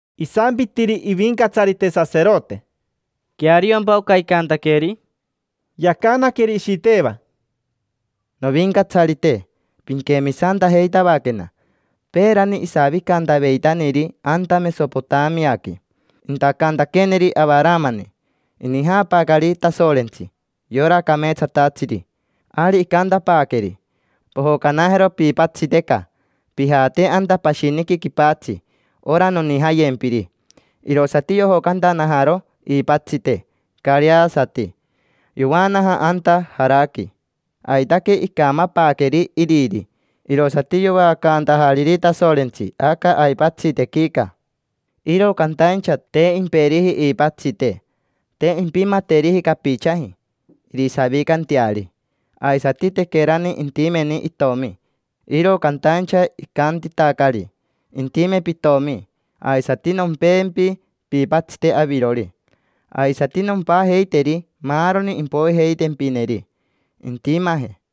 Isampitiri ivincatsarite saserote: —¿Queariompa oca icantaqueri? Yacanaqueri Ishiteva: —Novincatsarite, pinquemisantajeitavaquena. Peerani isavicantaveitaniri anta Mesopotamiaqui intacantaqueeniri Avaramani, inijaapaacari Tasorentsi, yora cameetsatatsiri. Ari icantapaaqueri: “Pojocanajero piipatsiteca, pijate anta pashiniqui quipatsi ora nonijayempiri”. Irosati yojocantanajaro iipatsite careasati, yovaanaja anta Jaraqui. Aitaque icamapaaqueri iriri, irosati yovaacaantajariri Tasorentsi aca aipatsitequica. Iro cantaincha, te imperiji iipatsite, te impimateriji capichaji irisavicanteari. Aisati tequerani intimeni itomi. Iro cantaincha icantitacari: “Intime pitomi, aisati nompempi piipatsite avirori. Aisati nompajeiteri maaroni impoijeitempineri intimaje”.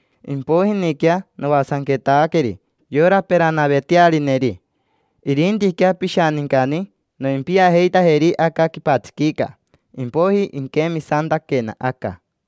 Impoijiniquea noasanquetaqueri yora peranavetearineri. Irintiquea pishanincani, noimpiajeitajeri aca quipatsiquica, impoiji inquemisantaquena aca.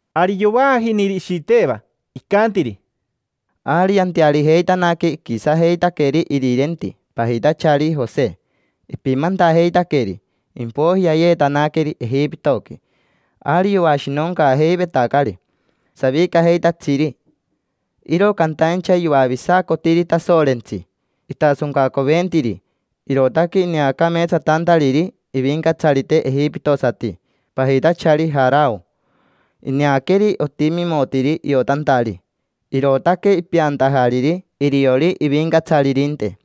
Ari yovaajiniri Ishiteva, icantiri: —Ari yantearijeitanaque, iquisajeitaqueri irirenti, pajitachari Jose. Ipimantajeitaqueri, impoiji yayeetanaqueri Ejipitoqui. Ari yoashinoncaajeivetacari savicajeitatsiri, iro cantaincha yoavisacotiri Tasorentsi. Itasoncacoventiri, irootaque ineacameetsatantariri ivincatsarite ejipitosati, pajitachari Jarao. Ineaqueri otimimotiri iotantari, irootaque ipeantajariri iriori ivincatsaririnte.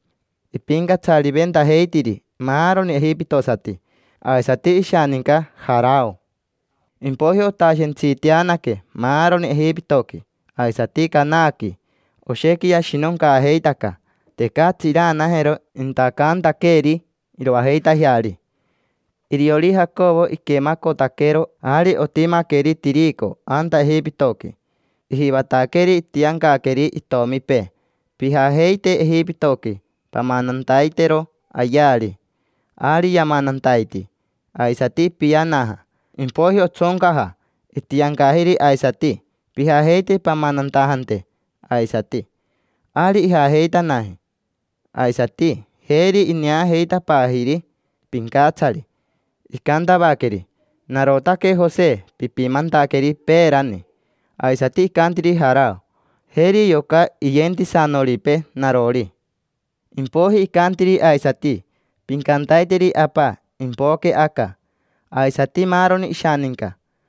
Ipincatsariventajeitiri maaroni ejipitosati, aisati ishaninca Jarao. Impoiji otashentsiiteanaque maaroni Ejipitoqui, aisati Cananaqui. Oshequi yashinoncaajeitaca, tecatsi iraanajero intacantaqueeri iroajeitajeari. Iriori Jacovo iquemacotaquero ari otimaqueri tirico anta Ejipitoqui. Ijivataqueri itiancaqueri itomipee: “Pijajeite Ejipitoqui pamanantaitero ayeari”. Ari yamanantaiti, aisati ipianaja. Impoiji otsoncaja, itiancajiri aisati: “Pijajeite pamanantajante aisati”. Ari ijajeitanaji aisati, jeri ineajeitapaajiri pincatsari. Icantavaqueri: “Narotaque Jose pipimantaqueri peerani”. Aisati icantiri Jarao: “Jeri yoca iyentisanoripee narori”. Impoiji icantiri aisati: “Pincantaiteri apa impoque aca, aisati maaroni ishaninca”.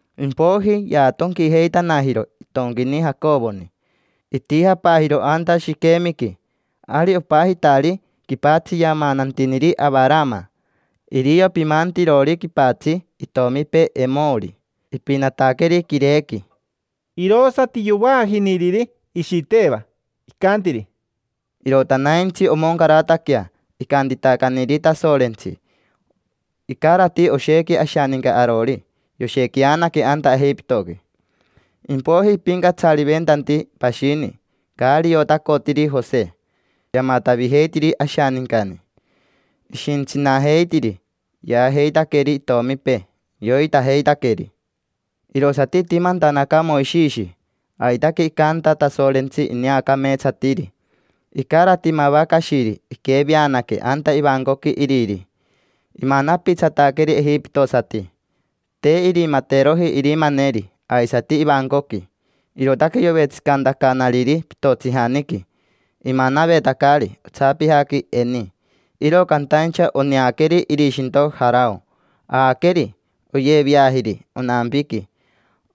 Impoiji yaatonquijeitanajiro itonquini Jacovoni, itijapaajiro anta Shiquemiqui, ari opajitari quipatsi yamanantiniri Avarama. Irio pimantirori quipatsi itomipee Emori. Ipinataqueri quirequi. Irosati yovaajiniriri Ishiteva, icantiri: —Irotanaintsi omoncarataquea icantitacaniri Tasorentsi. Icarati oshequi ashaninca arori, yoshequianaque anta Ejipitoqui. Impoiji ipincatsariventanti pashini, caari iotacotiri Jose. Yamatavijeitiri ashanincani. Ishintsitsanajeitiri, yaajeitaqueri itomipee, yoitajeitaqueri. Irosati itimantanaca Moishishi. Aitaque icanta Tasorentsi, ineacameetsatiri. Icarati mava cashiri iqueveanaque anta ivancoqui iriri, imanapitsataqueri ejipitosati. Te irimateroji irimaneri aisati ivancoqui, irootaque yovetsicantacanariri pitotsijaniqui, imanavetacari otsapijaqui eni. Iro cantaincha oneaqueri irishinto Jarao, aaqueri. Oyeveajiri onampiqui,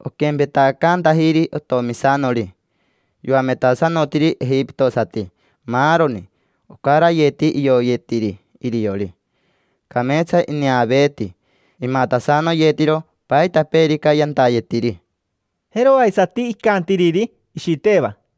oquempetacantajiri otomisanori. Yoametasanotiri ejipitosati maaroni ocarayeti ioyetiri iriori. Cameetsa ineaveeti. Imatasanoyetiro paitapeerica yantayetiri. Jero aisati icantiriri Ishiteva: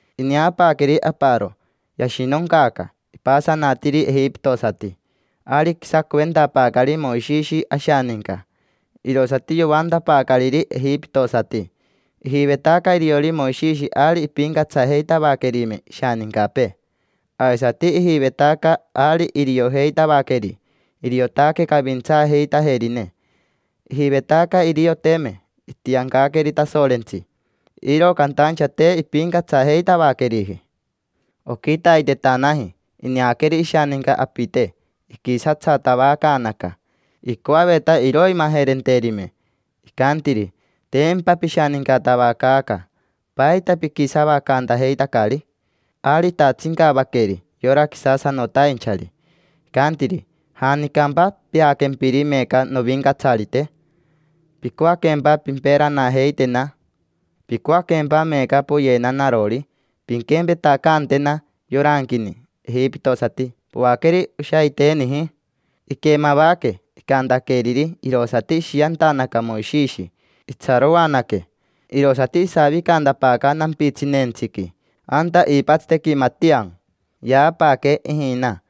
Ineapaaqueri aparo, yashinoncaaca: ipasanatiri ejipitosati. Ari iquisacoventapaacari Moishishi ashaninca, irosati yoantapaacariri ejipitosati. Ijivetaca iriori Moishishi ari impincatsajeitavaquerime ishanincapee, aisati ijivetaca ari iriojeitavaqueri iriotaque cavintsaajeitajerine. Ijivetaca irioteme itiancaqueri Tasorentsi, iro cantaincha te impincatsajeitavaqueriji. Oquitaitetanaji ineaqueri ishaninca apite, iquisatsatavacaanaca. Icoaveta iroimajerenterime. Icantiri: “Tempa pishanincatavacaaca. ¿Paita piquisavacantajeitacari?” Ari itatsincavaqueri yora quisasanotainchari, icantiri: “¿Janicampa peaquempiri meeca novincatsarite? ¿Picoaquempa pimperanajeitena? ¿Picoaquempa meeca poyena narori, pinquempetacantena yoranquini ejipitosati poaqueri oshaiteniji?” Iquemavaque icantaqueriri, irosati ishiantanaca Moishishi, itsaroanaque. Irosati isavicantapaaca nampitsineentsiqui anta iipatsitequi Matia. Yaapaaque ijina,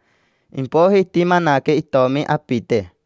impoiji itimanaque itomi apite.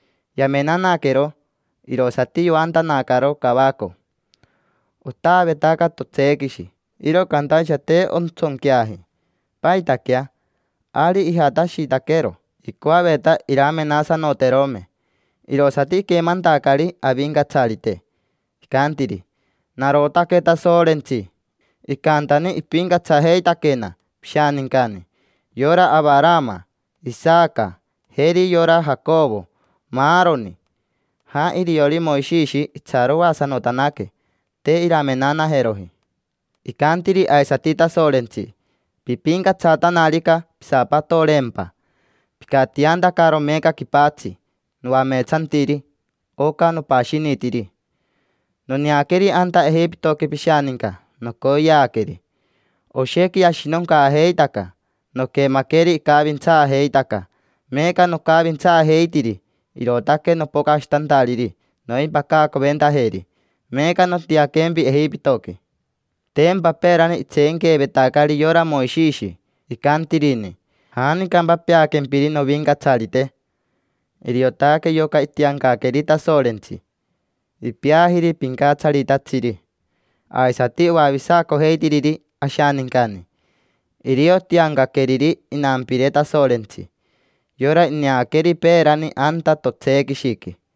Yamenanaquero, irosati yoantanacaro cavaco: “Otaavetaca totseequishi, iro cantaincha te ontsonqueaji. ¿Paitaquea?” Ari ijatashitaquero, icoaveta iramenasanoterome. Irosati iquemantacari Avincatsarite, icantiri: “Narotaque Tasorentsi, icantani ipincatsajeitaquena pishanincani: yora Avarama, Isaca, jeri yora Jacovo, maaroni”. Jaa iriori Moishishi itsaroasanotanaque, te iramenanajeroji. Icantiri aisati Tasorentsi: “Pipincatsatanarica, pisapatoreempa, picatiantacaro meeca quipatsi noameetsantiri, oca nopashinitiri. Noneaqueri anta Ejipitoqui pishaninca nocoyeaqueri, oshequi yashinoncaajeitaca. Noquemaqueri icavintsaajeitaca, meeca nocavintsaajeitiri. Irootaque nopocashitantariri noimpacacoventajeri. Meeca, nontianquempi Ejipitoqui”. Tempa peerani itseenqueevetacari yora Moishishi, icantirini: “¿Janicampa peaquempiri novincatsarite?” Iriotaque yoca itiancaqueri Tasorentsi. Ipeajiri pincatsaritatsiri, aisati oavisacojeitiriri ashanincani. Irio tiancaqueriri inampire Tasorentsi, yora ineaqueri peerani anta totseequishiqui.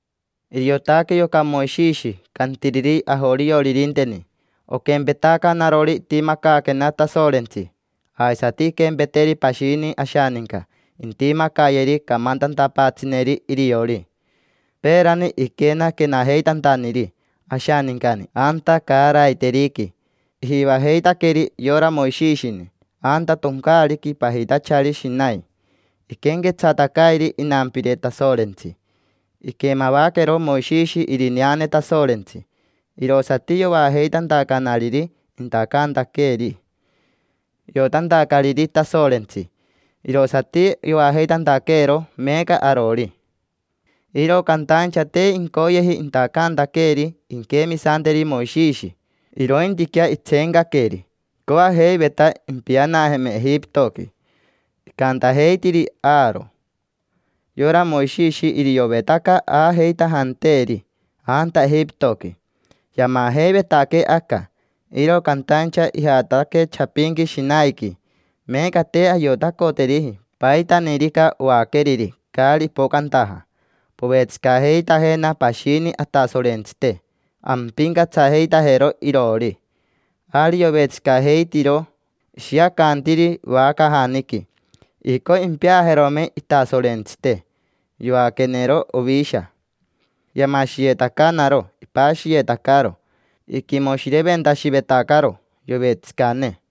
—Iriotaque yoca Moishishi cantiriri ajorioririnteni: “Oquempetaca narori itimacaaquena Tasorentsi, aisati inquempeteri pashini ashaninca intimacayeri: camantantapaatsineri iriori”. Peerani iquenaquenajeitantaniri ashanincani anta caaraiteriqui, ijivajeitaqueri yora Moishishini. Anta toncaariqui pajitachari Shinai iquenquetsatacairi inampire Tasorentsi. Iquemavaquero Moishishi irineane Tasorentsi, irosati yovaajeitantacanariri intacantaqueeri, iotantacariri Tasorentsi. Irosati yovaajeitantaqueero meeca arori. Iro cantaincha te incoyeji intacantaqueeri inquemisanteri Moishishi, irointiquea itseencaqueri. Icoajeiveta impianajeme Ejipitoqui. Icantajeitiri Aaro: “Yora Moishishi iriovetaca aajeitajanteeri anta Ejipitoqui, yamajeivetaquee aca. Iro cantaincha ijataque chapinqui Shinaiqui. Meeca te ayotacoteriji paitanirica oaqueriri caari ipocantaja. Povetsicajeitajena pashini atasorentsite, ampincatsajeitajero iroori”. Ari yovetsicajeitiro, ishiacantiri vacajaniqui. Icoi impeajerome itasorentsite. Yoaquenero ovisha, yamashiyetacanaro, ipashiyetacaro. Iquimoshireventashivetacaro yovetsicane.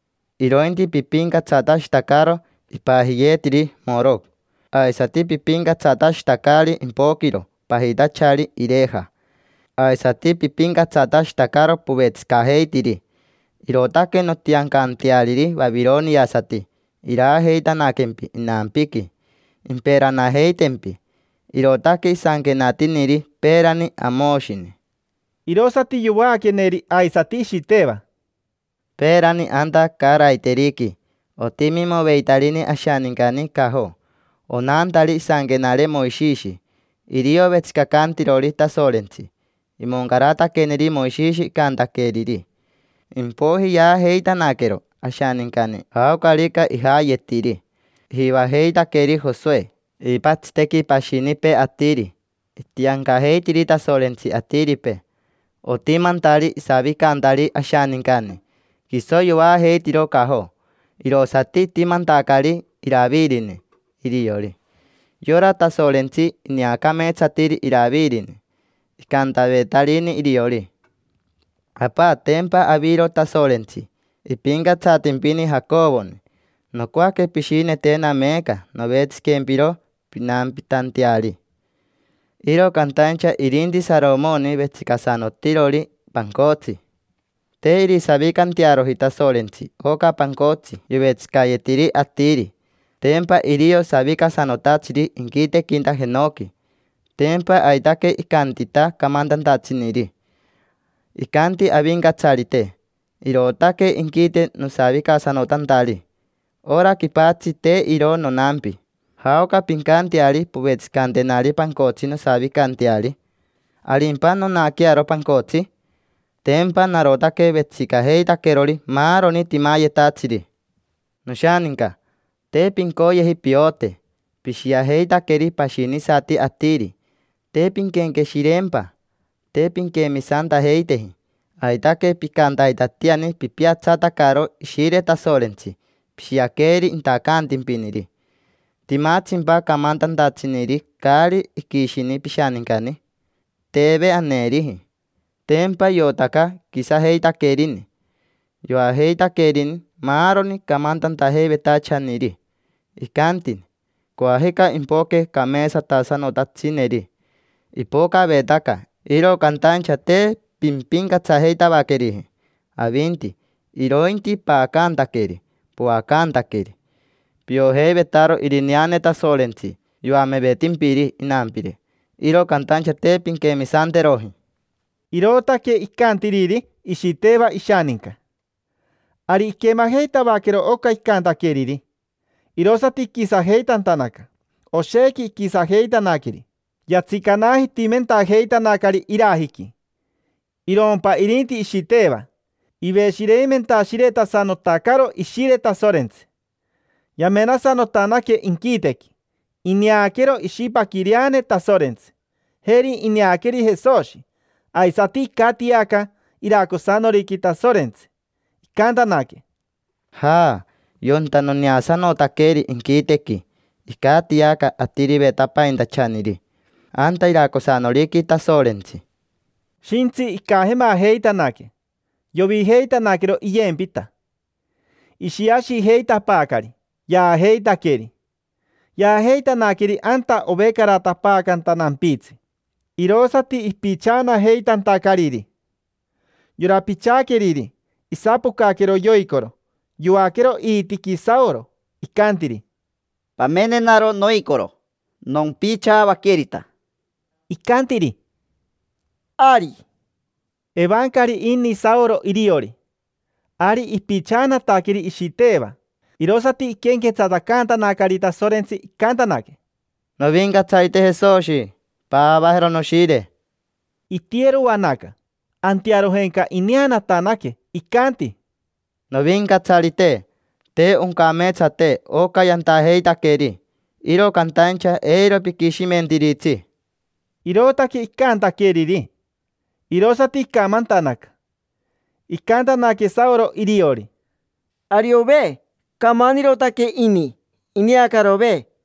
Irointi pipincatsatashitacaro ipajiyeetiri Maroco. Aisati pipincatsatashitacari impoquiro pajitachari Ireja. Aisati pipincatsatashitacaro povetsicajeitiri. Irootaque nontiancanteariri vavironiasati iraajeitanaquempi inampiqui, imperanajeitempi’”. Irootaque isanquenatiniri peerani Amoshini. Irosati yovaaqueneri aisati Ishiteva: —Peerani anta caaraiteriqui otimimoveitarini ashanincani cajo, onantari isanquenare Moishishi. Irio vetsicacantirori Tasorentsi. Imoncarataqueneri Moishishi icantaqueriri. Impoiji yaajeitanaquero ashanincani jaocarica ijayetiri. Ijivajeitaqueri Josoe iipatsitequi pashinipee atiri. Itiancajeitiri Tasorentsi atiripee, otimantari isavicantari ashanincani. Quiso yoajeitiro cajo, irosati itimantacari Iravirini iriori. Yora Tasorentsi ineacameetsatiri Iravirini. Icantavetarini iriori: “Apa, tempa aviro Tasorentsi, ipincatsatimpini Jacovoni. Nocoaque pishinetena meeca novetsiquempiro pinampitanteari”. Iro cantaincha irinti Saromoni vetsicasanotirori pancotsi. Te irisavicantearoji Tasorentsi oca pancotsi yovetsicayetiri atiri. Tempa irio savicasanotatsiri inquitequinta jenoqui. Tempa aitaque icantita camantantatsiniri: “Icanti Avincatsarite: ‘Irootaque inquite nosavicasanotantari. Ora quipatsi, te iro nonampi. ¿Jaoca pincanteari povetsicantenari pancotsi nosavicanteari? ¿Arimpa nonaquearo pancotsi? Tempa narotaque vetsicajeitaquerori maaroni timayetatsiri’”. Noshaninca, te pincoyeji piote. Pishiajeitaqueri pashinisati atiri: te pinquenqueshireempa. Te pinquemisantajeiteji. Aitaque picantaitatiani pipiatsatacaro Ishire Tasorentsi. Pishiaqueri intacantimpiniri. ¿Timatsimpa camantantatsiniri caari iquishini pishanincani? Teve aneeriji, tempa iotaca iquisajeitaquerini. Yoajeitaquerini maaroni camantantajeivetachaniri; icantini: “Coajica impoque cameetsatasanotatsineri”. Ipocavetaca, iro cantaincha te pimpincatsajeitavaqueriji avinti, irointi paacantaqueri, poacantaqueri. Piojeivetaro irineane Tasorentsi yoamevetimpiri inampire, iro cantaincha te pinquemisanteroji. Irootaque icantiriri Ishiteva ishaninca. Ari iquemajeitavaquero oca icantaqueriri, irosati iquisajeitantanaca. Oshequi iquisajeitanaqueri, yatsicanajitimentajeitanacari irajiqui, taquiririri. Irompa irinti Ishiteva, iveshireimentashiretasanotacaro Ishire Tasorentsi. Yamenasanotanaque inquitequi, ineaquero ishipaquireane Tasorentsi. Jeri ineaqueri Jesoshi aisati, icatiaca iracosanoriqui Tasorentsi. Icantanaque: —Jaa, yonta noneasanotaqueri inquitequi, icatiaca Atirivetapaintachaniri anta iracosanoriqui Tasorentsi. Shintsi icajemajeitanaque, yovijeitanaquero iyempita, ishiashijeitapaacari. Yaajeitaqueri, shepi; yaajeitanaqueri anta ovecaratapaacanta nampitsi. Irosati ipichaanajeitantacariri. Yora pichaaqueriri, isapocaquero yoicoro, yoaquero iitiqui Saoro, icantiri: —Pamenenaro noicoro, nompichaavaquerita. Icantiri: —Ari. Evancari ini Saoro iriori. Ari ipichaanataqueri Ishiteva, irosati iquenquetsatacantanacari Tasorentsi, icantanaque: —Novincatsarite Jesoshi, paavajero noshire. Itiyeroanaca, antearojenca ineanatanaque, icanti: —Novincatsarite, te oncameetsate oca yantajeitaqueri, iro cantaincha eiro piquishimentiritsi. Irootaque icantaqueriri, irosati icamantanaca, torein. Icantanaque Saoro iriori: —Ariove, camanirotaque ini; ineacarove.